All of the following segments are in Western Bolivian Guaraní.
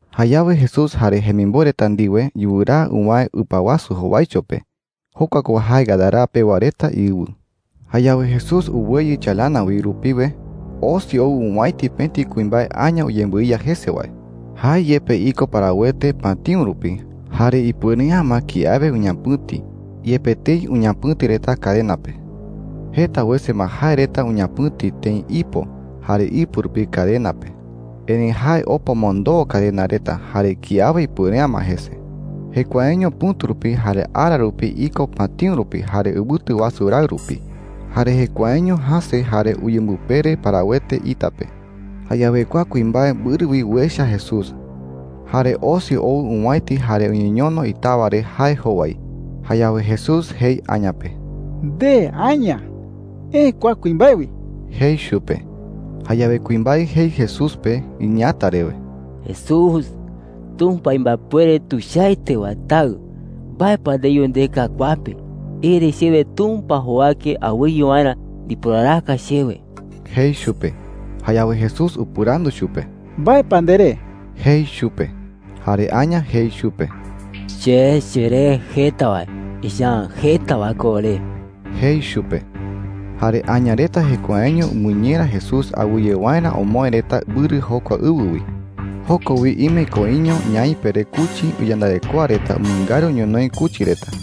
Jayawe Jesús jare jemimboe reta ndiwe yuraa uwäe ɨpa wasu jowaicho pe. Jokua ko jae Gadara pewa reta iɨwɨ. Jayawe Jesús uweyɨ chalana wi rupiwe, osi ou owäiti pëti kuimbae aña uyembɨiya jese wae. Jae yepe iko parawete patïu rupi. Jare ipuere’ä ma kiawe uñapɨ̈ti, yepe tëi uñapɨ̈ti reta cadena pe. Jeta wese ma jae reta uñapɨ̈ti tëi ipo jare ipɨ rupi cadena pe. Erëi jae opa omondoo cadena reta. Jare kiawe ipuere’ä ma jese. Jekuaeño pɨ̈tu rupi jare ara rupi iko patïu rupi jare ɨwɨtu wasu raɨ rupi. Jare jekuaeño jäse jare uyembɨpere parawete ita pe. Jayawe kua kuimbae mbɨrɨ wi uecha Jesús. Jare osi ou owäiti jare uñeñono itawa re jae jowai. Jayawe Jesús jei aña pe: “Nde aña, eë kua kuimbae wi,” jei chupe. Jayawe kuimbae jei Jesús pe iñeeäta rewe: “Jesús, Tumpa imbaepuere tuichaete wae Taɨ, ¿mbae pa ndeyu ndeka kua pe? Ere chewe Tumpa jowake awɨye waerä ndiporaraka chewe,” jei chupe. Jayawe Jesús upɨrandu chupe: “¿Mbae pa nderee?” jei chupe. Jare aña jei chupe: “Che cheree Jeta Wae. Echa’ä jeta wae ko ore,” jei chupe. Jare aña reta jekuaeño umɨñera Jesús awɨye waerä omoë reta mbɨrɨ jokua ɨwɨ wi. Joko wi ime koiño ñaipe re kuchi iyandarekoa reta umɨngaru ñonoï kuchi reta.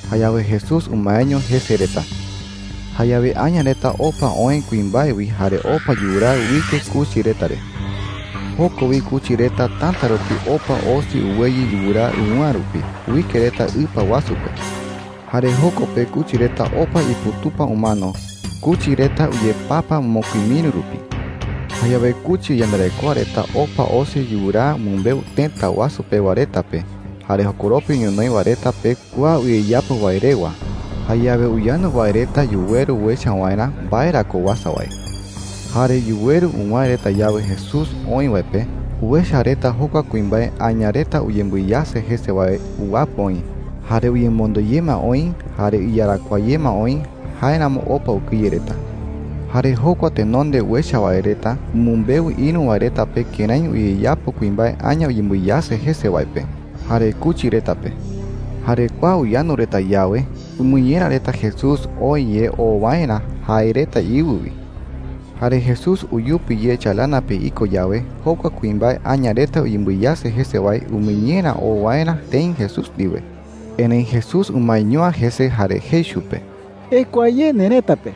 Jayawe Jesús umaeño jese reta. Jayawe aña reta opa oë kuimbae wi jare opa yuraa uike kuchi reta re. Joko wi kuchi reta täta rupi opa osi uweyɨ yuraa ɨwɨ̈a rupi uike reta ɨpa wasu pe. Jare joko pe kuchi reta opa iputupa umano. Kuchi reta uyepapa mokui miri rupi. Jayawe kuchi iyandarekoa reta opa osi yuraa umɨmbeu tëta wasu pewa reta pe jare jokoropi ñonoï wae reta pe kua uyeyapo wae rewa. Jayawe uyandu wae reta yuweru uecha waerä mbae ra ko uasa wae. Jare yuweru uwäe reta yawe Jesús oï wae pe, uecha reta jokua kuimbae aña reta uyembɨiyase jese wae uwapɨ oï, jare uyemonde ye ma oï, jare iyarakuaa ye ma oï. Jáeramo opa ukɨye reta. Jare jokua tenonde uecha wae reta umɨmbeu ïru wae reta pe kërái uyeyapo kuimbae aña uyembɨiyase jese wae pe jare kuchi reta pe. Jare kua uyandu reta yawe, umɨñera reta Jesús oë ye oo waerä jae reta iɨwɨ wi. Jare Jesús uyupi ye chalana pe iko yawe, jokua kuimbae aña reta uyembɨiyase jese wae umɨñera oo waerä tëi Jesús ndiwe. Erëi Jesús umaeño’ä jese jare jei chupe: “Ekua ye nerëta pe,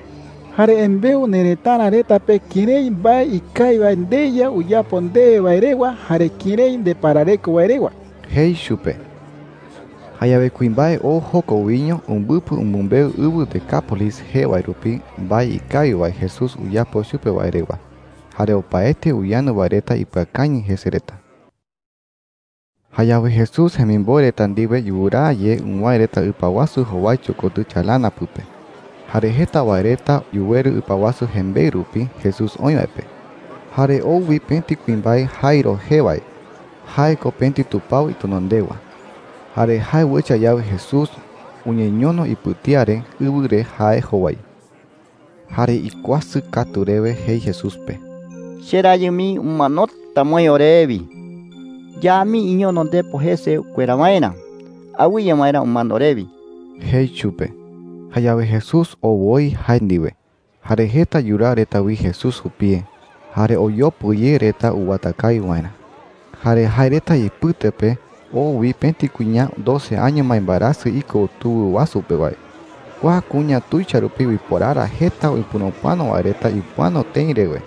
jare embeu nerëtara reta pe kërái mbae ikawi wae ndeYa uyapo ndewe wae rewa jare kërái ndeparareko wae rewa,” jei chupe. Jayawe kuimbae oo joko wiño umbɨpɨ umɨmbeu ɨwɨ Decápolis jee wae rupi mbae ikawi wae Jesús uyapo chupe wae rewa. Jare opaete uyandu wae reta ipɨakañɨ jese reta. Jayawe Jesús jemimboe reta ndiwe yuraa ye uwäe reta ɨpa wasu jowaicho kotɨ chalana pɨpe. Jare jeta wae reta yuweru ɨpa wasu jembeɨ rupi Jesús oï wae pe. Jare ou wi pëti kuimbae Jairo jee wae. Jae ko pëti tupao itenondewa. Jare jae uecha yawe Jesús, uñeñono ipɨtía re ɨwɨ re jae jowai. Jare ikuasɨ katu rewe jei Jesús pe: “Cherayɨ mii umanota ma oï orewi,” jei chupe. “Ya mii iñono ndepo jese ukuera waerä, awɨye waerä umano orewi,” jei chupe. Jayawe Jesús oo woi jae ndiwe. Jare jeta yuraa reta wi Jesús jupie, jare oyopɨ ye reta uwata kawi waerä. Jare jae reta ipɨte pe oo wi pëti kuña doce año ma imbaerasɨ iko tuwɨ wasu pe wae. Kua kuña tuicha rupi uiporara jeta upurupɨano wae reta uipɨano tëi rewe,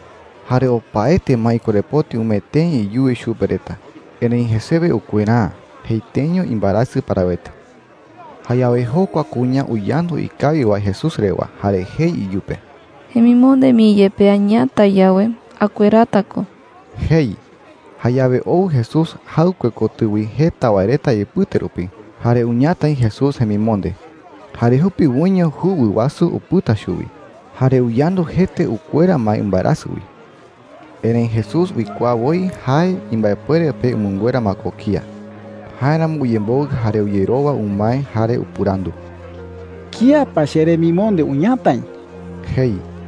jare opaete ma ikorepoti umee tëi iyuwi chupe reta. Erëi jesewe ukuera’ä. Jeieteño imbaerasɨ parawete. Jayawe jokua kuña uyandu ikawi wae Jesús rewa. Jare jei iyupe: “Jemimonde mii yepe añatai yawe, akuerata ko,” jei. Jayawe ou Jesús jaɨkue kotɨ wi jeta wae reta ipɨte rupi, jare uñatai Jesús jemimonde. ¡Jare jupiwoiño juwɨ wasu upɨta chuwi, jare uyandu jete ukuera ma imbaerasɨ wi! Erëi Jesús uikuaa woi jae imbaepuere pe umɨnguera ma ko kía. Jáeramo uyemboɨ jare uyerowa umae. Jare upɨrandu: “¿Kía pa cheremimonde uñatai?” jei.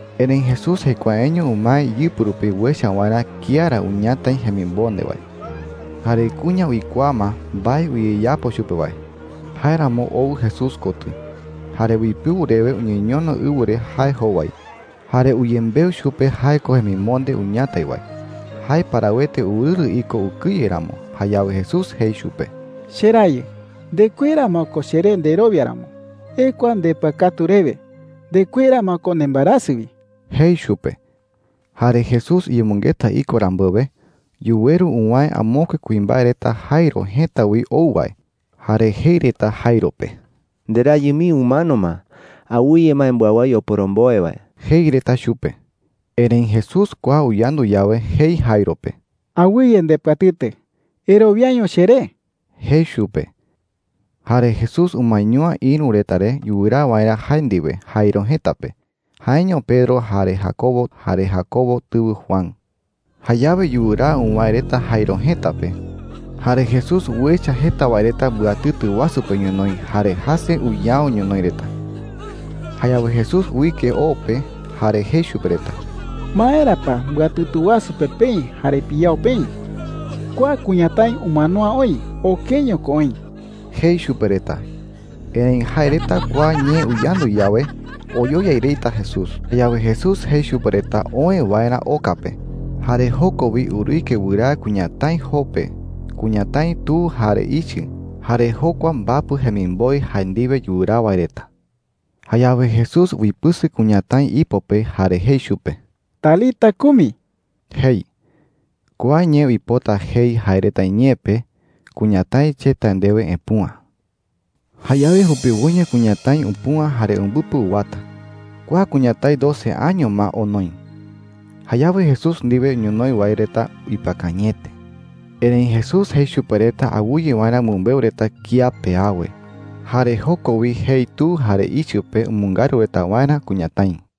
Erëi Jesús jekuaeño umae iyɨpɨ rupi uecha waerä kía ra uñatai jemimonde wae. Jare kuña uikuaa ma mbae uyeyapo chupe wae. Jáeramo ou Jesús kotɨ, jare uipɨu rewe uñeñono ɨwɨ re jae jowai. Jare uyembeu chupe jae ko jemimonde uñatai wae. Jae parawete urɨrɨ iko ukɨye ramo. Jayawe Jesús jei chupe: “Cherayɨ, ndekuera ma ko cheré nderowia ramo. Ekua ndepɨakatu rewe. Ndekuera ma ko nembaerasɨ wi,” jei chupe. Jare Jesús uyemɨngeta iko rambuewe, yuweru uwäe amokue kuimbae reta Jairo jëta wi ou wae. Jare jei reta Jairo pe: “Nderayɨ mii umano ma. Awɨye ma embɨawái oporomboe wae,” jei reta chupe. Erëi Jesús kua uyandu yawe, jei Jairo pe: “Awɨye ndepɨatɨtɨ. Erowiaño cheré,” jei chupe. Jare Jesús umaeño’ä ïru reta re yuraa waerä jae ndiwe Jairo jëta pe – jaeño Pedro, jare Jacobo, jare Jacobo tɨwɨ Juan. Jayawe yuraa uwäe reta Jairo jëta pe. Jare Jesús uecha jeta wae reta mbɨatɨtɨ wasu pe ñonoï jare jäse uyao ñonoï reta. Jayawe Jesús uike o pe jare jei chupe reta: “¿Maera pa mbɨatɨtɨ wasu pe peï jare piyao peï? Kua kuñatái umano’ä oï. Okeño ko oï,” jei chupe reta. Erëi jae reta kua ñee uyandu yawe, oyoyai reta Jesús. Jayawe Jesús jei chupe reta oë waerä oka pe. Jare joko wi uruike wɨraa kuñatái joo pe kuñatái tu jare ichɨ, jare jokua mbapɨ jemimboe jae ndiwe yuraa wae reta. Jayawe Jesús uipɨsɨ kuñatái ipo pe jare jei chupe: “Talita kumi,” jei. (Kua ñee uipota jei jae reta iñee pe, “Kuñatái, che tae ndewe, epüa.”) ¡Jayawe jupiwoiño kuñatái upüa jare umbɨpɨ uwata! Kua kuñatái doce año ma onoi. Jayawe Jesús ndiwe ñonoï wae reta ipɨakañɨete. Erëi Jesús jei chupe reta awɨye waerä umɨmbeu reta kía pe awe. Jare joko wi jei tu jare ichɨ pe umɨngaru reta waerä kuñatái.